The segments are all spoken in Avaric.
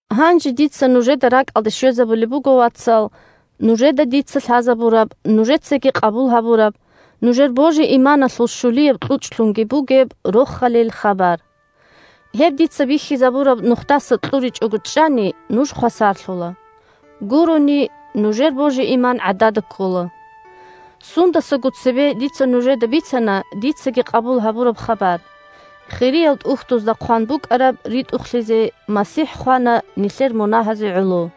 Гьанже дица нужеда ракӀалде щвезабулеб буго, вацал, нужеда дица лъазабураб, нужецаги къабул гьабураб, нужер божи-иманалъул щулияб кьучӀлъунги бугеб Рохалил хабар. Гьеб дица бихьизабураб нухдаса кьуричӀого чӀани, нуж хвасарлъула. Гурони – нужер божи-иман гӀадада ккола. Сундасаго цебе дица нужеда бицана дицаги къабул гьабураб хабар: Хириял ТӀухьдузда хъван букӀараб ритӀухълъизе, МасихӀ хвана нилъер мунагьазе гӀоло.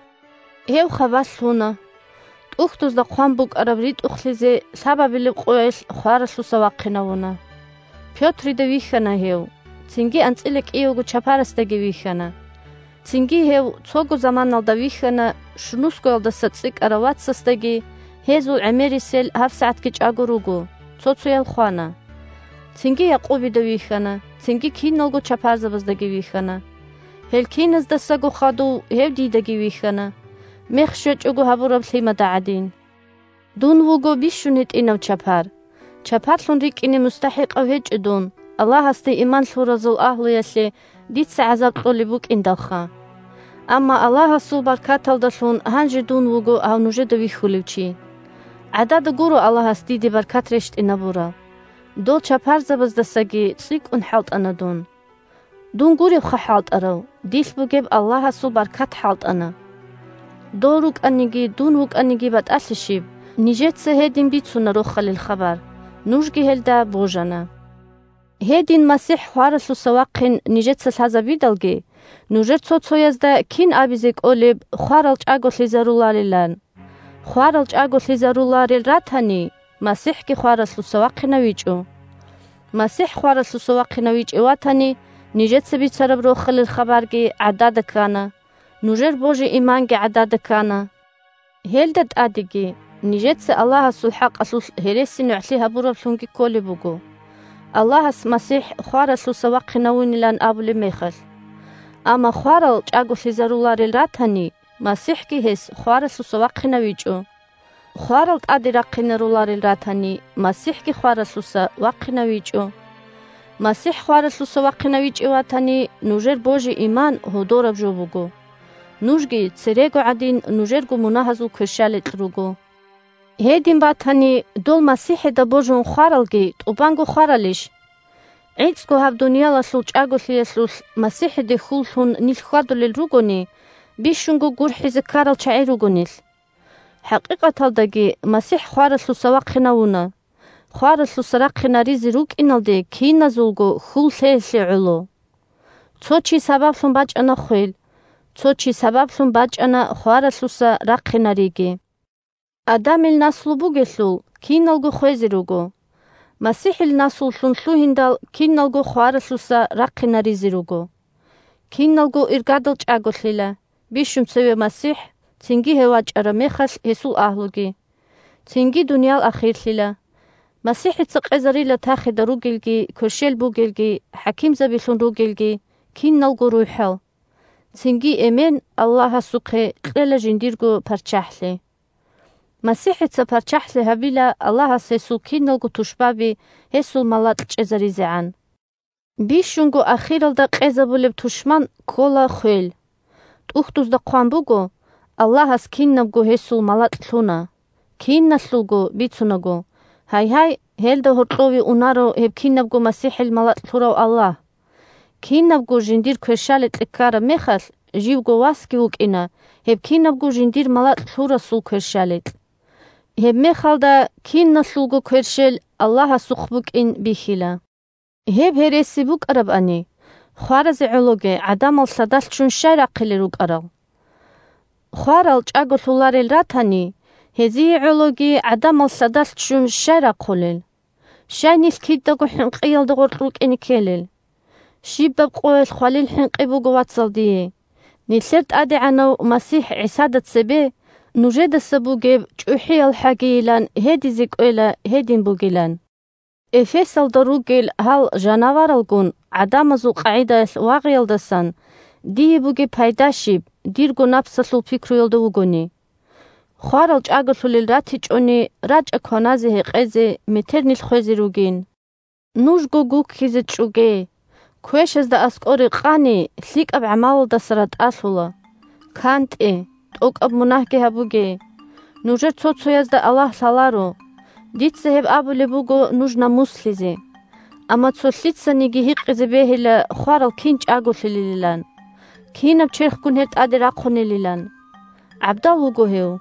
Гьев хабалъ лъуна. ТӀухьдузда хъван букӀараб ритӀухълъизе, лъабабилеб къоялъ хваралъуса вахъинавуна. Пётрида вихьана гьев, цинги анцӀила кӀиявго чапарасдаги вихьана. Цинги гьев цого заманалда вихьана щунусгоялдаса цӀикӀкӀарав вацасдаги, гьезул гӀемерисел гьабсагӀатги чӀаго руго, цо-цоял хвана. Цинги Якъубида вихьана, цинги киналго чапарзабаздаги вихьана. Гьел киназдасаго хадув гьев дидаги вихьана, мех щвечӀого гьабураб лъимада гӀадин. Дун вуго бищунго гьитӀинав чапар. Чапарлъун рикӀкӀине мустахӀикъав гьечӀо дун, Аллагьасде иман лъуразул агьлуялъе дица гӀазаб кьолеб букӀиндалха. Амма Аллагьасул баркаталдалъун гьанже дун вуго гьав нужеда вихьулев чи. ГӀадада гуро Аллагьас диде баркат рещтӀинабураб. Дол чапарзабаздасаги цӀикӀкӀун хӀалтӀана дун. Дун гуревха хӀалтӀарав, дилъ бугеб Аллагьасул баркат хӀалтӀана. Дол рукӀаниги, дун вукӀаниги батӀалъи щиб, нижеца гьедин бицуна Рохалил хабар, нужги гьелда божана. Гьедин, МасихӀ хваралъуса вахъин нижеца лъазабидалги, нужер цо-цоязда кин абизе кӀолеб хварал чӀаголъизаруларилан? Хварал чӀаголъизаруларел ратани, МасихӀги хваралъуса вахъинавичӀо. МасихӀ хваралъуса вахъинавичӀев ватани, нижеца бицараб Рохалил хабарги гӀадада ккана, нужер божи-иманги гӀадада ккана. Гьелда тӀадеги, нижеца Аллагьасул хӀакъалъулъ гьересинугӀлъи гьабураблъунги кколеб буго, – Аллагьас МасихӀ хваралъуса вахъинавунилан абулеб мехалъ. Амма хварал чӀаголъизаруларел ратани, МасихӀги гьес хваралъуса вахъинавичӀо. Хварал тӀаде рахъинаруларел ратани, МасихӀги хваралъуса вахъинавичӀо. МасихӀ хваралъуса вахъинавичӀев ватани, нужер божи-иман гьодораб жо буго, нужги церего гӀадин нужерго мунагьазул кверщаликь руго. Гьедин батани, дол МасихӀида божун хваралги тӀубанго хваралищ? ГӀицӀго гьаб дуниялалъул чӀаголъиялъулъ МасихӀиде хьул лъун нилъ хьвадулел ругони, бищунго гурхӀизе ккарал чагӀи руго нилъ. ХӀакъикъаталдаги МасихӀ хваралъуса вахъинавуна, – хваралъуса рахъинаризе рукӀиналде киназулго хьул лъеялъе гӀоло. Цо чи сабаблъун бачӀана хвел, цо чи сабаблъун бачӀана хваралъуса рахъинариги. Адамил наслу бугелъул киналго хвезе руго, МасихӀил наслулъун лъугьиндал, киналго хваралъуса рахъинаризе руго. Киналго иргадал чӀаголъила: бищун цеве МасихӀ, цинги гьев вачӀараб мехалъ – гьесул агьлуги. Цинги дуниял ахирлъила. МасихӀица къезарила тахида ругелги, кверщел бугелги, хӀакимзабилъун ругелги – киналго рухӀал, цинги Эмен – Аллагьасухъе кьела жиндирго парччахӀлъи. МасихӀица парччахӀлъи гьабила Аллагьас гьесул киналго тушбаби гьесул малакь чӀезаризегӀан. Бищунго ахиралда къезабулеб тушман ккола хвел. ТӀухьдузда хъван буго: «Аллагьас кинабго гьесул малакь лъуна». «Киналъулго» бицунаго, гьайгьай, гьелда гьоркьове унаро гьеб кинабго МасихӀил малакь лъурав Аллагь. Кинабго жиндир кверщаликье ккараб мехалъ, живго Васги вукӀина гьеб кинабго жиндир малакь лъурасул кверщаликь. Гьебмехалда киналъулго кверщел Аллагьасухъ букӀин бихьила. Гьеб гьереси букӀарабани, хваразе гӀологи гӀадамал лъадалъ ччун щай рахъилел рукӀарал? Хварал чӀаголъуларел ратани, гьезие гӀологи гӀадамал лъадалъ ччун щай рахъулел? Щай нилъ кидаго хӀинкъиялда гъоркь рукӀине ккелел? Щибаб къоялъ хвалил хӀинкъи буго, вацал, дие. Нилъер ТӀадегӀанав МасихӀ ГӀисада цебе нужедаса бугеб чӀухӀиялхӀагийилан гьедизе кӀвела гьедин бугилан. Эфесалда ругел гьал жанаваралгун гӀадамазул къагӀидаялъ вагъиялдасан дие бугеб пайда щиб, дирго напсалъул пикруялда вугони? Хварал чӀаголъулел ратичӀони, «рачӀа кваназе-гьекъезе, метер нилъ хвезе ругин». Нужго гуккизе чӀоге. Квешазда аскӀоре къани, лъикӀаб гӀамалалдаса ратӀалъула. КантӀе, тӀокӀаб мунагьги гьабуге. Нужер цо-цоязда Аллагь лъаларо. Дица гьеб абулеб буго нуж намуслъизе. Амма цо лъицаниги гьикъизе бегьила хварал кин чӀаголъулелилан. Кинаб черхгун гьел тӀаде рахъунелилан. ГӀабдал вуго гьев.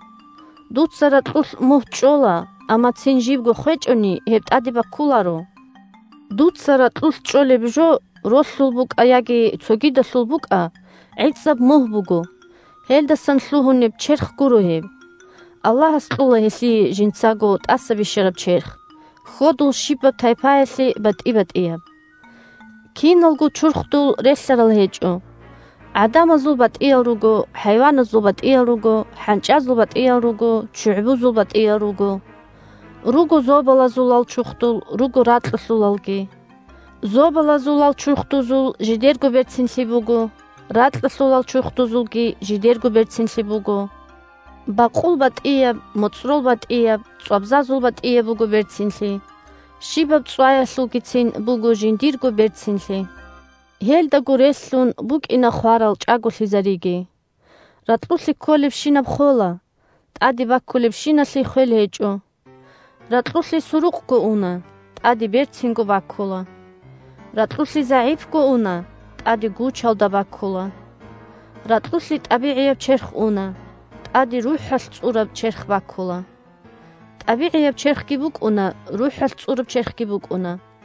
Дуца ракьулъ мугь чӀола, амма цин жибго хвечӀони, гьеб тӀаде баккуларо. Дуца ракьулъ чӀолеб жо, ролъул букӀа яги цогидалъул букӀа, гӀицӀаб мугь буго, гьелдасан лъугьунеб «черх» гуро гьеб. Аллагьас кьола гьелъие жинцаго тӀаса бищараб черх – хьодул щибаб тайпаялъе батӀи-батӀияб. Киналго чурхдул релълъарал гьечӀо: гӀадамазул батӀиял руго, хӀайваназул батӀиял руго, хӀанчӀазул батӀиял руго, ччугӀбузул батӀиял руго. Руго зобалазулал чурхдул, руго ракьалъулалги. Зобалазулал чурхдузул жидерго берцинлъи буго, ракьалъулал чурхдузулги жидерго берцинлъи буго. Бакъул батӀияб, моцӀрол батӀияб, цӀвабзазул батӀияб буго берцинлъи. Щибаб цӀваялъулгицин буго жиндирго берцинлъи. Гьелдаго релълъун букӀина хварал чӀаголъизариги. Ракьулъе кколебщинаб хола, тӀаде баккулебщиналъе хвел гьечӀо. Ракьулъе сурукъго уна, тӀаде берцинго баккула. Ракьулъе загӀипго уна, тӀаде гучалда баккула. Ракьулъе тӀабигӀияб черх уна, тӀаде рухӀалъ цӀураб черх баккула. ТӀабигӀияб черхги букӀуна, рухӀалъ цӀураб черхги букӀуна.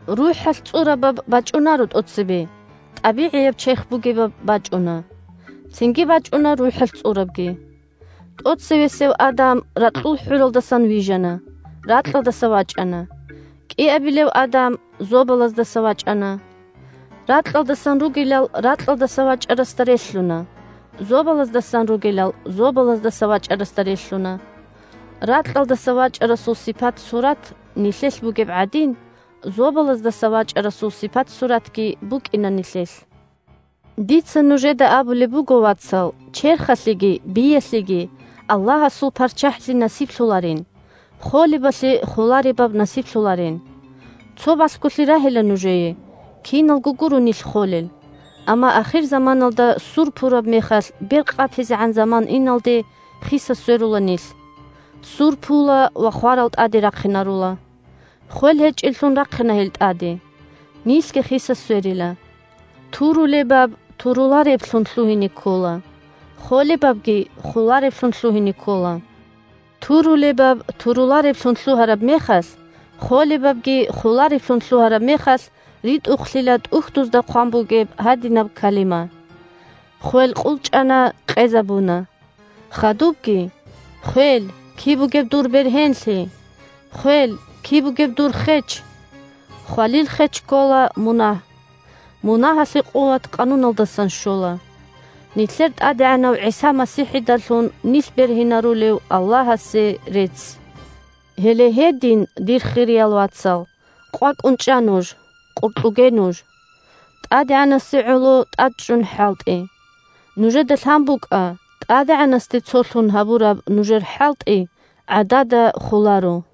РухӀалъ цӀурабаб бачӀунаро тӀоцебе, тӀабигӀияб черх бугебаб бачӀуна. Цинги бачӀуна рухӀалъ цӀурабги. ТӀоцевесев Адам ракьул хӀуралдасан вижана, ракьалдаса вачӀана. КӀиабилев Адам зобалаздаса вачӀана. Ракьалдасан ругелал ракьалдаса вачӀарасда релълъуна. Зобалаздасан ругелал зобалаздаса вачӀарасда релълъуна. Ракьалдаса вачӀарасул сипат-сурат нилъелъ бугеб гӀадин, зобалаздаса вачӀарасул сипат-суратги букӀина нилъелъ. Дица нужеда абулеб буго, вацал, черхалъеги биялъеги Аллагьасул парччахӀлъи насиблъуларин, холебалъе холаребаб насиблъуларин. Цо балъголъи рагьила нужее: киналго гуро нилъ холел, амма ахирзаманалда ссур пураб мехалъ, бер къапизегӀан заман иналде, хиса-сверула нилъ. Ссур пула ва хварал тӀаде рахъинарула. Хвел гьечӀеллъун рахъина гьел тӀаде. Нилъги хиса-сверила. Турулебаб турулареблъун лъугьине ккола, холебабги холареблъун лъугьине ккола. Турулебаб турулареблъун лъугьараб мехалъ, холебабги холареблъун лъугьараб мехалъ ритӀухълъила ТӀухьдузда хъван бугеб гьадинаб калима: «Хвел къулчӀана, къезабуна». Хадубги: «Хвел, киб бугеб дур бергьенлъи! Хвел, киб бугеб дур хеч!» Хвалил хеч ккола мунагь. Мунагьалъе къуват Къануналдасан щола. Нилъер ТӀадегӀанав ГӀиса МасихӀидалъун нилъ бергьинарулев Аллагьасе рецц! Гьеле гьедин, дир хириял вацал, къвакӀун чӀа нуж, къуркьуге нуж. ТӀадегӀанасе гӀоло тӀадчӀун хӀалтӀе. Нужеда лъан букӀа: ТӀадегӀанасде цолъун гьабураб нужер хӀалтӀи гӀадада холаро.